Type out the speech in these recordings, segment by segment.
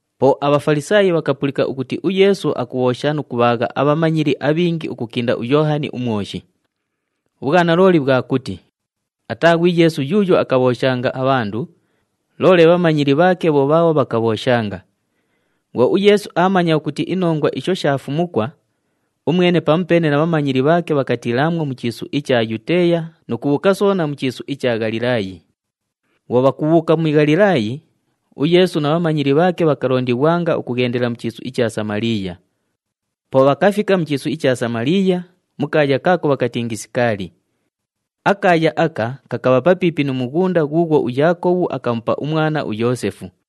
Po aBhafalisaayi bhakapulika ukuti uYeesu akubhoosha nu kubhaagha abhamanyili abhingi ukukinda uYoohani uMwoshi. Ubhwanalooli bhwa kuti ataa ghwi Yeesu yuuyo akabhooshanga abhandu, loole bhamanyili bhaake bho bhaabho bhakabhooshanga. Bhwo uYeesu aamanya ukuti inongwa isho shaafumukwa, umwene pamupeene na bhamanyili bhaake bhakatiilaamwo mu chiisu icha Yuteeya nu kubhuuka soona mu chiisu icha Ghalilaayi. Bhwo bhakubhuuka mu Ghalilaayi, uYeesu na bhamanyili bhaake bhakalondighwanga ukughendela mu chiisu icha Samaliiya. Po bhakafika mu chiisu icha Samaliiya, mu kaaya kaako bhakatingi Sikaali. Akaaya aka kakabha papiipi nu mughunda ghuughwo uYaakobhu akamupa umwana, uYoosefu.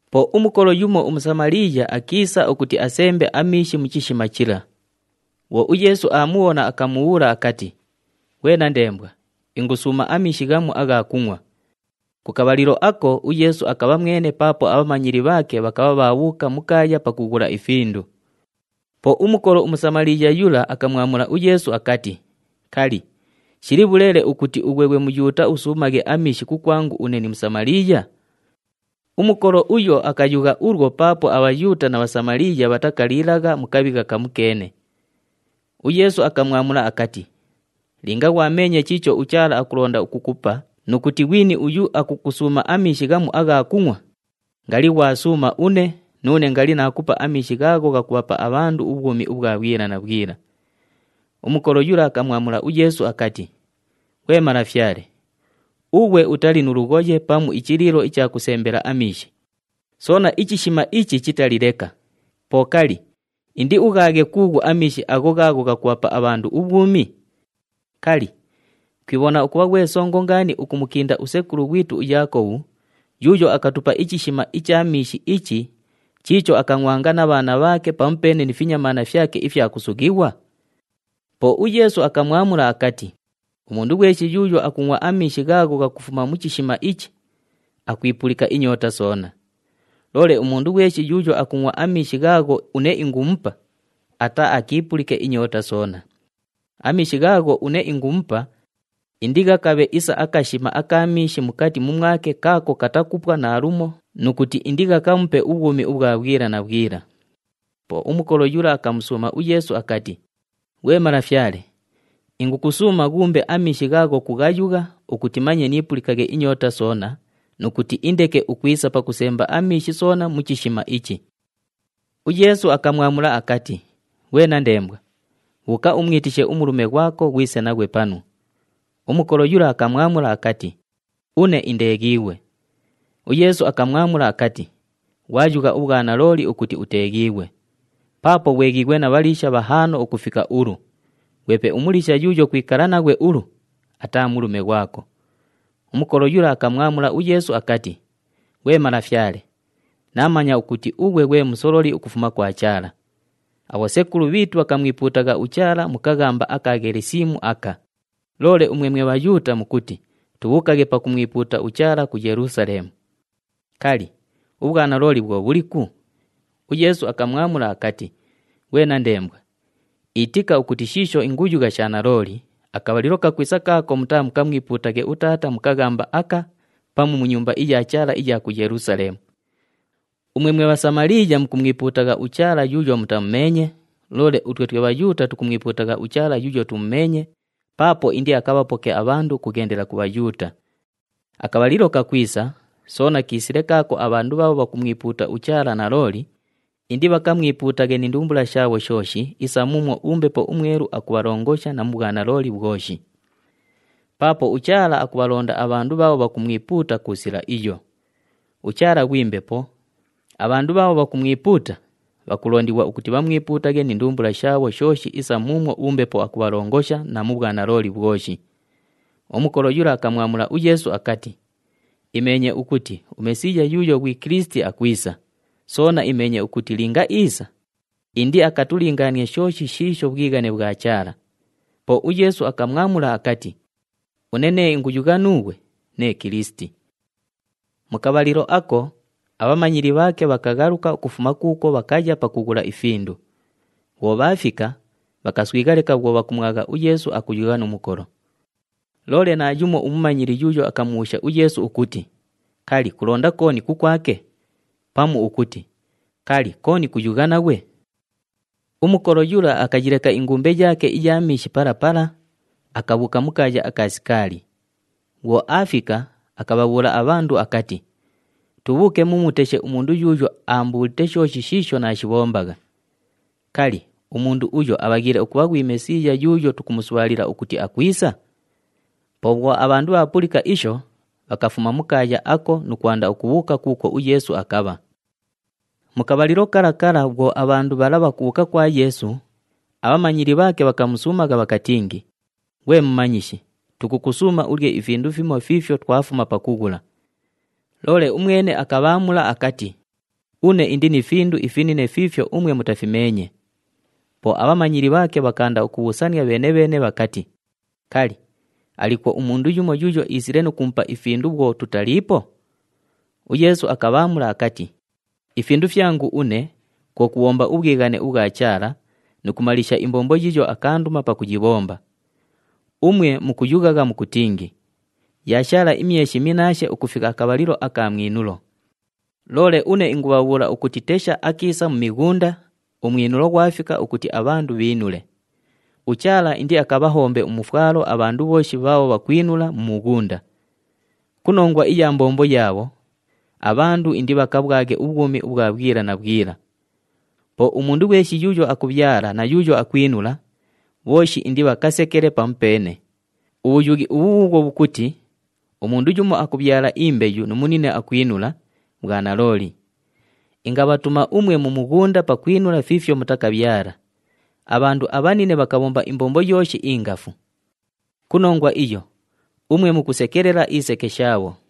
Po umukolo yumo uMusamaliiya akiisa ukuti asembe amiishi mu chishima chila. Bhwo uYeesu aamubhona, akamubhuula akati, “Ghwe nandembwa, ingusuuma amiishi ghamu agha kungʼwa.” Ku kabhalilo ako uYeesu akabha mwene paapo abhamanyili bhaake bhakabha bhaabhuuka mu kaaya pakughula ifindu. Po umukolo uMusamaliiya yula akamwamula uYeesu akati, “Kali, shili bhuleele ukuti ughwe ghwe Muyuuta usuumaghe amiishi kukwangu une ni Musamaliiya?” Umukolo uyo akayugha ulwo paapo aBhayuuta na Bhasamaliiya bhatakaliilagha mu kabhigha kamukeene. UYeesu akamwamula akati, “Linga ghwameenye chiicho uChaala akulonda ukukupa nu kuti ghwini uyu akukusuuma amiishi ghamu agha kungʼwa, ngali ghwasuuma une, nuune ngali naakupa amiishi ghaagho ghakubhapa abhandu ubhwumi ubhwa bhwila na bhwila.” Umukolo yula akamwamula uYeesu akati, “Ghwe Malafyale, ughwe utali nu lughoye pamu ichiliilo icha kusembela amiishi, soona ichishima ichi chitali leka, po kali, indiughaaghe kuughu amiishi agho ghaagho ghakubhapa abhandu ubhwumi? Kali, kwibhona ukubha ghwe songo ngaani ukumukinda usekulu ghwitu uYaakobhu yuuyo akatupa ichishima icha miishi ichi chiicho akangʼwanga na bhaana bhaake pamupeene ni finyamaana fyake ifya kusughighwa?” Po uYeesu akamwamula akati, “Umundu ghweshi yuuyo akungʼwa amiishi ghaagho ghakufuma mu chishima ichi, akwipulika inyoota soona. Loole umundu ghweshi yuuyo akungʼwa amiishi ghaagho une ingumupa, ataaakiipulike inyoota soona. Amiishi ghaagho une ingumupa, indighakabhe isa akashima aka miishi mukati mumwake kaako katakupwa naalumo nu kuti indighakamupe ubhwumi ubhwa bhwila na bhwila.” Po umukolo yula akamusuuma uYeesu akati, “Ghwe Malafyale, ingukusuuma ghuumbe amiishi ghaagho kughayugha ukuti manye niipulikaghe inyoota soona nu kuti indeke ukwisa pakusemba amiishi soona mu chishima ichi!” UYeesu akamwamula akati, “Ghwe nandembwa, bhuuka umwitishe umulume ghwako ghwise naghwe panu.” Umukolo yula akamwamula akati, “Une indeeghiighwe.” UYeesu akamwamula akati, “Ghwayugha ubhwanalooli ukuti uteeghiighwe! Paapo ghweghighwa na bhaliisha bhahaano ukufika ulu, ghwepe umuliisha yuuyo kwikala naghwe ulu, ataa mulume ghwako.” Umukolo yula akamwamula uYeesu akati, “Ghwe Malafyale, naamanya ukuti ughwe ghwe musololi ukufuma kwa Chaala. Abhosekulu bhiitu bhakamwipuutagha uChaala mu kaghamba aka Ghelisimu aka, loole umwe mwe Bhayuuta mukuti tubhuukaghe pakumwipuuta uChaala ku Yelusaleemu. Kali, ubhwanalooli bhwo bhuliku?” UYeesu akamwamula akati, “Ghwe nandembwa, itika ukuti shiisho inguyugha sha nalooli, akabhalilo kakwisa kaako mutaamukamwipuutaghe uTaata mu kaghamba aka pamu mu Nyumba iya Chaala iya ku Yelusaleemu. Umwe mwe Bhasamaliiya mukumwipuutagha uChaala yuuyo mutamumeenye, loole utwe twe Bhayuuta tukumwipuutagha uChaala yuuyo tumumeenye paapo indiakabhapoke abhandu ukughendela ku Bhayuuta. Akabhalilo kakwisa, soona kiisile kaako abhandu bhaabho bhakumwipuuta uChaala nalooli indibhakamwipuutaghe ni ndumbula shaabho shooshi isa muumwo uMbepo uMwelu akubhalongosha na mu bhwanalooli bhwoshi. Paapo uChaala akubhalonda abhandu bhaabho bhakumwipuuta ku sila iyo. UChaala ghwi Mbepo, abhandu bhaabho bhakumwipuuta, bhakulondighwa ukuti bhamwipuutaghe ni ndumbula shaabho shooshi isa muumwo uMbepo akubhalongosha na mu bhwanalooli bhwoshi.” Umukolo yula akamwamula uYeesu akati, “Imeenye ukuti uMesiiya yuuyo ghwi Kilisiti akwisa, soona imeenye ukuti linga iisa, indiakatulingaanie shooshi shiisho bhwighane bhwa Chaala.” Po uYeesu akamwamula akati, “Une nee inguyugha nuughwe, nee Kilisiti.” Mu kabhalilo ako, abhamanyili bhaake bhakaghaluka ukufuma kuukwo bhakaya pakughula ifindu. Bhwo bhaafika, bhakaswigha leka bhwo bhakumwagha uYeesu akuyugha nu mukolo. Loole naayumo umumanyili yuuyo akamubhuusha uYeesu ukuti, “Kali, kulonda kooni kukwake?” Pamu ukuti, “Kali, kooni kuyugha naghwe?” Umukolo yula akayileka ingumbe yaake iya miishi pala pala, akabhuuka mu kaaya aka Sikaali. Bhwo aafika, akabhabhuula abhandu akati, “Tubhuuke mumuteshe umundu yuuyo aambuulite shooshi shiisho naashibhombagha. Kali, umundu uyo abhaghiile ukubha ghwi Mesiiya yuuyo tukumusubhaalila ukuti akwisa?” Po bhwo abhandu bhaapulika isho, bhakafuma mu kaaya ako nu kwanda ukubhuuka kuukwo uYeesu akabha. Mu kabhalilo kala kala bhwo abhandu bhala bhakubhuuka kwa Yeesu, abhamanyili bhaake bhakamusuumagha bhakatingi, “Ghwe Mumanyishi, tukukusuuma ulye ifindu fimo fiifyo twafuma pakughula.” Loole umwene akabhaamula akati, “Une indi ni findu ifinine fiifyo umwe mutafimeenye.” Po abhamanyili bhaake bhakaanda ukubhuusania bheene-bheene bhakati, “Kali, aliikwo umundu yumo yuuyo iisile nu kumupa ifindu bhwo tutaliipo?” UYeesu akabhaamula akati, “Ifindu fyangu une kwo kubhomba ubhwighane ubhwa Chaala nu kumaliisha imbombo yiiyo akaanduma pakuyibhomba. Umwe mukuyughagha mukutingi, ‘Yaashaala imyeshi minnaashe ukufika akabhalilo aka mwinulo.’ Loole une ingubhabhuula ukuti tesha akiisa mu mighunda, umwinulo ghwafika ukuti abhandu bhiinule. UChaala indiakabhahombe umufwalo abhandu bhooshi bhaabho bhakwinula mu mughunda. Ku nongwa iya mbombo yaabho, abhandu indibhakabhwaghe ubhwumi ubhwa bhwila na bhwila. Po umundu ghweshi yuuyo akubhyala na yuuyo akwinula, bhooshi indibhakasekele pamupeene. Ubhuyughi ubhu bhuubhwo bhukuti, ‘Umundu yumo akubhyala imbeyu nu munine akwinula,’ bhwa nalooli. Ingabhatuma umwe mu mughunda pakwinula fiifyo mutakabhyala. Abhandu abhanine bhakabhomba imbombo yooshi ingafu. Ku nongwa iyo, umwe mukusekelela iseke shaabho.”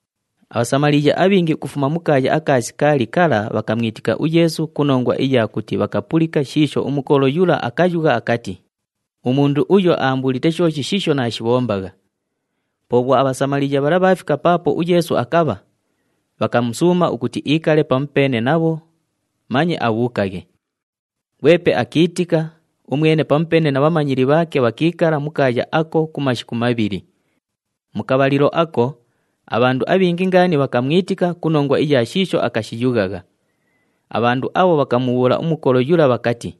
ABhasamaliiya abhingi ukufuma mu kaaya aka Sikaali kala bhakamwitika uYeesu ku nongwa iya kuti bhakapulika shiisho umukolo yula akayugha akati, “Umundu uyo aambuulite shooshi shiisho naashibhombagha.” Po bhwo aBhasamaliiya bhala bhaafika paapo uYeesu akabha, bhakamusuuma ukuti iikale pamupeene nabho, manye abhuukaghe. Ghwepe akiitika, umwene pamupeene na bhamanyili bhaake bhakiikala mu kaaya ako ku mashiku mabhili. Mu kabhalilo ako, abhandu abhingi ngaani bhakamwitika ku nongwa iya shiisho akashiyughagha. Abhandu abho bhakamubhuula umukolo yula bhakati,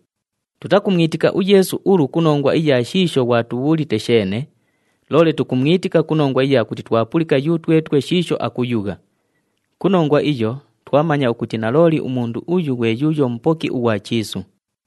“Tutakumwitika uYeesu ulu ku nongwa iya shiisho ghwatubhuulite sheene, loole tukumwitika ku nongwa iya kuti twapulika yutwetwe shiisho akuyugha. Ku nongwa iyo, twamanya ukuti nalooli umundu uyu ghwe yuuyo Mupoki ughwa chiisu.”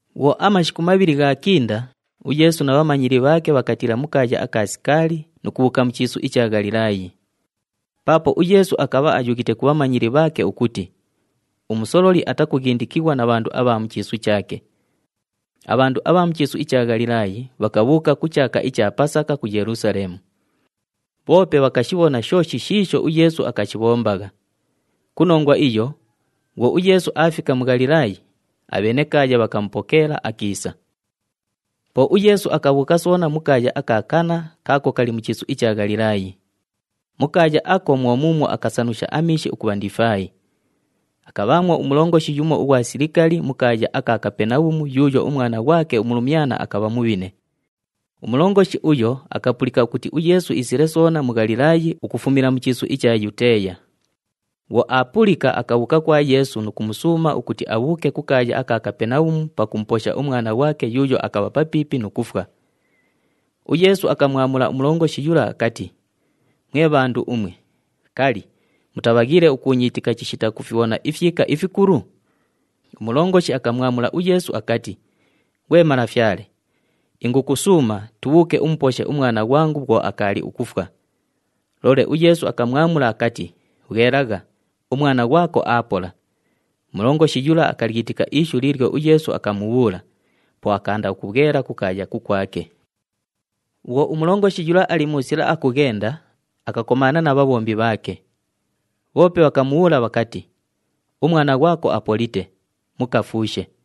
Bhwo amashiku mabhili ghaakinda, uYeesu na bhamanyili bhaake bhakatiila mu kaaya aka Sikaali nu kubhuuka mu chiisu icha Ghalilaayi. Paapo uYeesu akabha ayughite ku bhamanyili bhaake ukuti umusololi atakughindikighwa na bhandu abha mu chiisu chaake. Abhandu abha mu chiisu icha Ghalilaayi bhakabhuuka ku chaaka icha Pasaka ku Yelusaleemu. Bhoope bhakashibhona shooshi shiisho uYeesu akashibhombagha. Ku nongwa iyo, bhwo uYeesu aafika mu Ghalilaayi, abhenekaaya bhakamupokeela akiisa. Po uYeesu akabhuuka soona mu kaaya aka Kana kaako kali mu chiisu icha Ghalilaayi. Mu kaaya ako mwo muumwo akasanusha amiishi ukubha ndifaayi. Akabhaamwo umulongoshi yumo ughwa silikali mu kaaya aka Kapenabhumu yuuyo umwana ghwake umulumyana akabha mubhine. Umulongoshi uyo akapulika ukuti uYeesu iisile soona mu Ghalilaayi ukufumila mu chiisu icha Yuteeya. Bhwo aapulika, akabhuuka kwa Yeesu nu kumusuuma ukuti abhuuke ku kaaya aka Kapenabhumu pakumuposha umwana ghwake yuuyo akabha papiipi nu kufwa. UYeesu akamwamula umulongoshi yula akati, “Mwe bhandu umwe, kali, mutabhaghiile ukuunyiitika chishita kufibhona ifyika ifikulu?” Umulongoshi akamwamula uYeesu akati, “Ghwe Malafyale, ingukusuuma, tubhuuke umuposhe umwana ghwangu bhwo akaali ukufwa.” Loole uYeesu akamwamula akati, “Bhwelagha, umwana ghwako aapola.” Umulongoshi yula akalyitika ishu liilyo uYeesu akamubhuula, po akaanda ukubhwela kukaaya kukwake. Bhwo umulongoshi yula ali mu sila akughenda, akakomaana na bhabhombi bhaake. Bhoope bhakamubhuula bhakati, “Umwana ghwako apolite, mukafuushe.”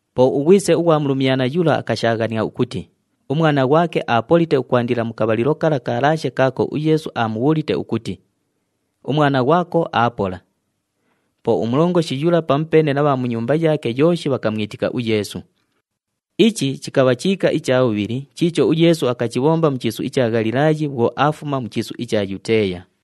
Po ughwise ughwa mulumyana yula akashaaghania ukuti, umwana ghwake aapolite ukwandila mu kabhalilo kala kalaashe kaako uYeesu aamubhuulite ukuti, “Umwana ghwako aapola.” Po umulongoshi yula pamupeene na bha mu nyumba yaake yooshi bhakamwitika uYeesu. Ichi chikabha chiika icha bhubhili chiicho uYeesu akachibhomba mu chiisu icha Ghalilaayi bhwo aafuma mu chiisu icha Yuteeya.